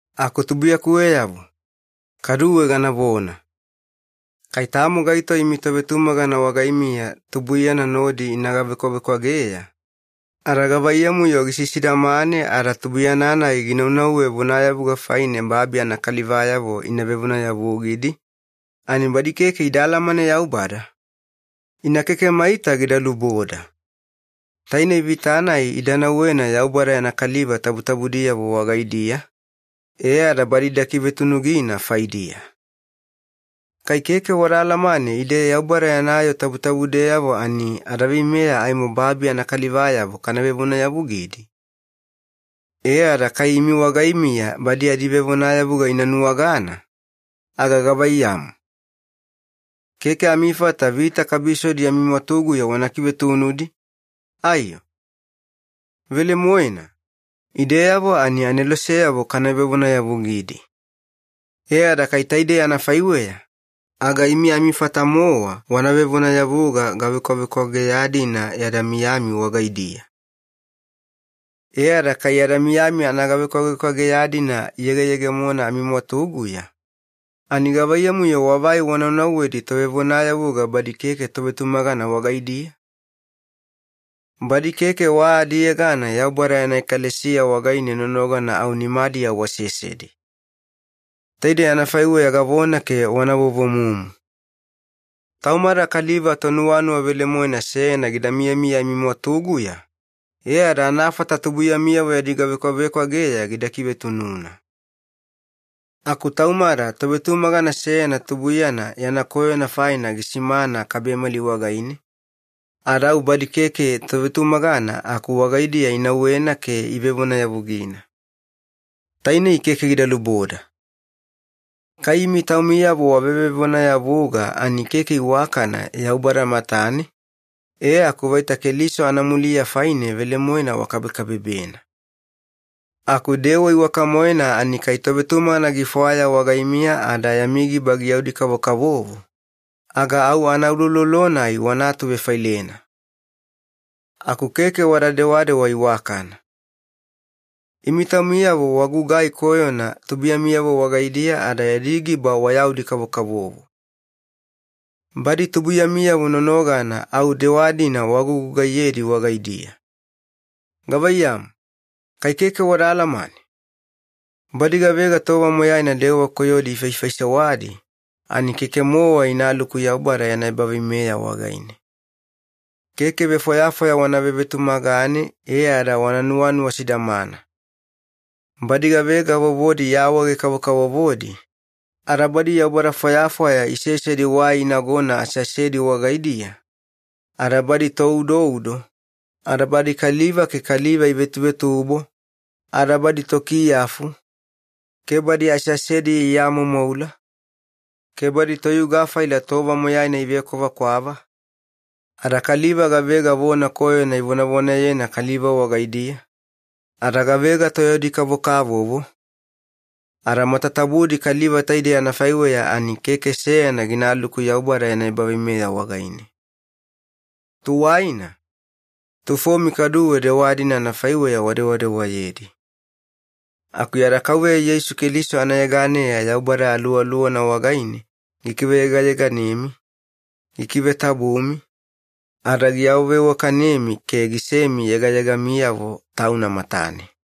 Aku tubuiyakuweyavo, kaduwe ganavona. Kai tamo gaito imi tovetumagana wagaimiya tubuiyana nodi ina gavekwavekwageya, ada gavaiyamu-yo gisisidamane ada tubuiyana-nai ginaunauwe vonayavuga faine babi anakalivayavo ina vevonayavugidi, ani badi keke ida alamane Yaubada? Ina keke maita gida luboda. Tainei vita-nai ida nauwena Yaubada yana kaliva tabutabudiyavo wagaidiya, e ada badi ida kivetunugina faidiya. Kai keke wada alamane ide Yaubada yana yoo tabutabudeyavo ani adaveimeya aimo babi anakalivayavo kana vevonayavugidi? E ada kai imi wagaimiya badi adivevonayavuga ina nuwagana, aga gavaiyamu? Keke amifata vita kabisodi amimwatuguya wana kivetunudi, aiyo? Velemoena, ideyavo ani aneloseyavo kana vevonayavugidi. E ada kai taidei anafaiweya, aga imi amifata-mowa wana vevonayavuga gavekwavekwageya-dina yada miyami wagaidiya. E ada kai yada miyami anagavekwavekwageya-dina iyegeyegemona amimwatuguya, ani gavaiyamu-yo wavai wanaunauwedi tovevonayavuga badi keke tovetumagana wagaidiya? Badi keke wa adiyegana Yaubada yana ekalesiya wagaine nonogana au nimadiya wasesedi. Taidei anafaiweya gavona ke wana vovomumu. Taumada kaliva tonuwanuwa velemoena seyana gida miyamiya amimwatuguya, e ada anafata tubuiyamiyavo yadi gavekwavekwageya gida kivetununa. Aku taumada tovetumagana seyana tubuiyana yana koyona faina gisimana kabemali wagaine, ada au badi keke tovetumagana aku wagaidiya inauwena ke ivevonayavugina. Tainei keke gida luboda. Kai imi taumiyavo wavevevonayavuga ani keke iwakana Yaubada matane, e aku vaita Keliso anamuliya faine velemoena wakabekabebena. Aku dewa iwaka-moena ani kai tovetumagana gifwaya wagaimiya ada yami giba giyaudi-kavokavovo, aga au anauloulolo-nai wana atuvefailena. Aku keke wada dewadewa iwakana. Imi taumiyavo wagugai koyona tubuiyamiyavo wagaidiya ada yadi giba wayaudi-kavokavovo. Badi tubuiyamiyavo nonogana au dewa-dina wagugugaiyedi wagaidiya. Gavaiyamu, kai keke wada alamane? Badi gavega tova moyaina dewa koyodi ifaifaisewadi, ani keke-mowa inaluku Yaubada yana ebaveimeya wagaine. Keke vefwayafwaya wana vevetumagane e ada wana nuwanuwa sidamana. Badi gavega vovodi iawaawaege-kavokavovodi, ada badi yaubada fwayafwaya isesedi wai inagona aseasedi wagaidiya, ada badi toudoudo, ada badi kaliva ke kaliva ivetuvetubo, ada badi tokiyafu, ke badi aseasediya iamoumoula, ke badi toyuga faila tova moyaina ivekwavakwava, ada kaliva gavega vona koyona ivonavonayena kaliva wagaidiya, ada gavega toyaudi-kavokavovo, ada matatabudi kaliva taidei anafaiweya ani keke seyana ginaluku Yaubada yana ebaveimeya wagaine. Tuwaina, tufomi kaduwe dewa-dina anafaiweya wadewadewayedi. Aku yada Kauveya Yeisu Keliso anayeganeya Yaubada Aluwaluwana wagaine gikiveyegayeganemi, gikivetabumi, ada giawaveiwakanemi ke gisemi yegayegamiyavo Tauna matane.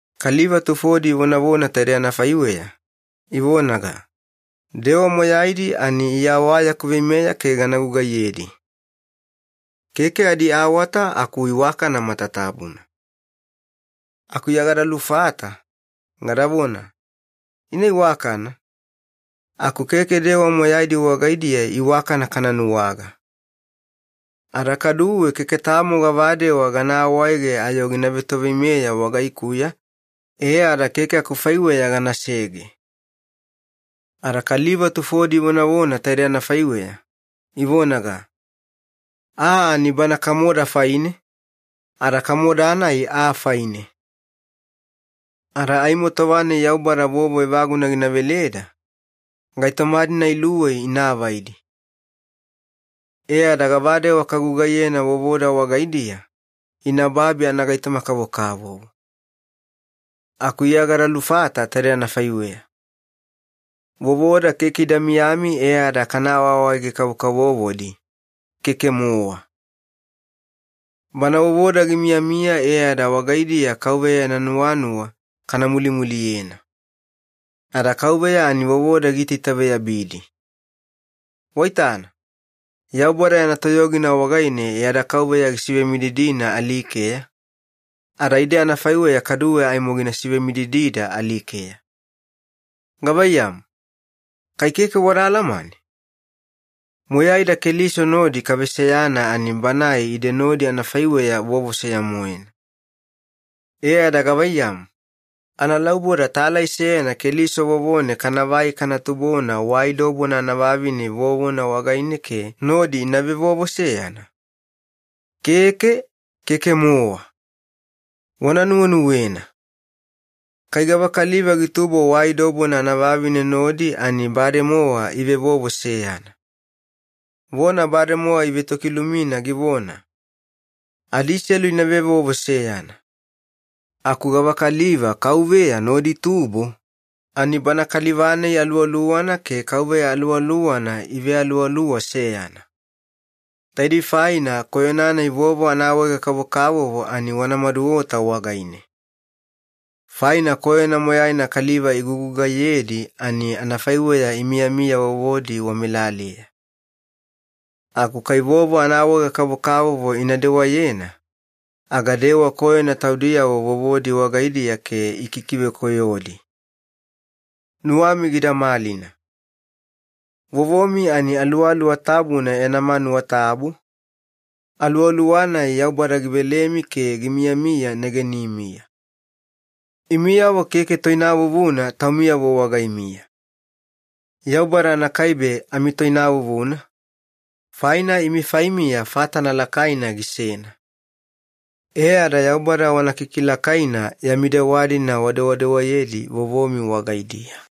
Kaliva tufodi ivonavona taide anafaiweya, ivonaga, “Dewa moyaidi ani Iya wa yaku veimeya ke gana gugaiyedi. Keke adiawata aku iwakana matatabuna.” Aku Iya gada lufata, gadavona, “Ina iwakana, aku keke dewa moyaidi wagaidiya iwakana kana nuwaga. Ada kaduwe keke tamo gavadewa gana awaege ayo gina vetoveimeya wagaikuya e ada keke akufaiweya ganasege.” Ada kaliva tufodi ivonavona taide anafaiweya, ivonaga, “Aa ani bana kamoda faine, ada kamoda-nai aa faine. Ada aimo tova-nai Yaubada vovo evaguna gina veleda, gaitoma-dina iluwei ina avaidi. E ada gavadewa kagugaiyena vovoda wagaidiya, ina babi anagaitoma-kavokavovo.” Aku Iya gada lufata taidei anafaiweya. Vovoda keke ida miyami e ada kana awaawaege-kavokavovodi, keke-mowa. Bana vovoda gimiyamiya e ada wagaidiya Kauveya yana nuwanuwa kana mulimuliyena. Ada Kauveya ani vovoda giitaitaveyabidi. Waitana, Yaubada yana toyogina wagaine yada Kauveya gisivemididina alikeya, ada ide anafaiweya kaduwe aimo gina sivemididida alikeya. Gavaiyamu, kai keke wada alamane? Moyaida Keliso nodi kaveseyana ani Banae ide nodi anafaiweya vovo seya-moena. E ada gavaiyamu, analauboda talai seyana Keliso vovone kanavai kana tubona wai dobona anavavine vovona wagaine ke nodi ina vevovo seyana? Keke, keke-mowa. Wana nuwenuwena. Kai gavakaliva gitubo wai dobona anavavine nodi ani bademowa ivevovo seyana. Vona bademowa ivetokilumina givona, “Adiselu ina vevovo seyana.” Aku gavakaliva Kauveya nodi itubo, ani bana kaliva-nai aluwaluwana ke Kauveya Aluwaluwana ivealuwaluwa seyana. Taidei faina koyona-nai vovo anaawaega-kavokavovo ani wana maduota wagaine. Faina koyona moyaina kaliva igugugaiyedi ani anafaiweya imiyamiya vovodi wamelaleya. Aku kai vovo anaawaega-kavokavovo ina dewayena, aga idewa koyona taudiyavo vovodi wagaidiya ke ikikivekoyodi. Nuwami gida malina. Vovomi ani Aluwaluwa Tabuna yana manuwa tabu, Aluwaluwana-nai Yaubada givelemi ke gimiyamiya negenimiya. Imiyavo keke toinavuvuna taumiyavo wagaimiya. Yaubada anakaibe amitoinavuvuna, faina imi faimiya fatana lakaina gisena. E ada Yaubada wana kikilakaina yami dewa-dina wadewadewayedi vovomi wagaidiya.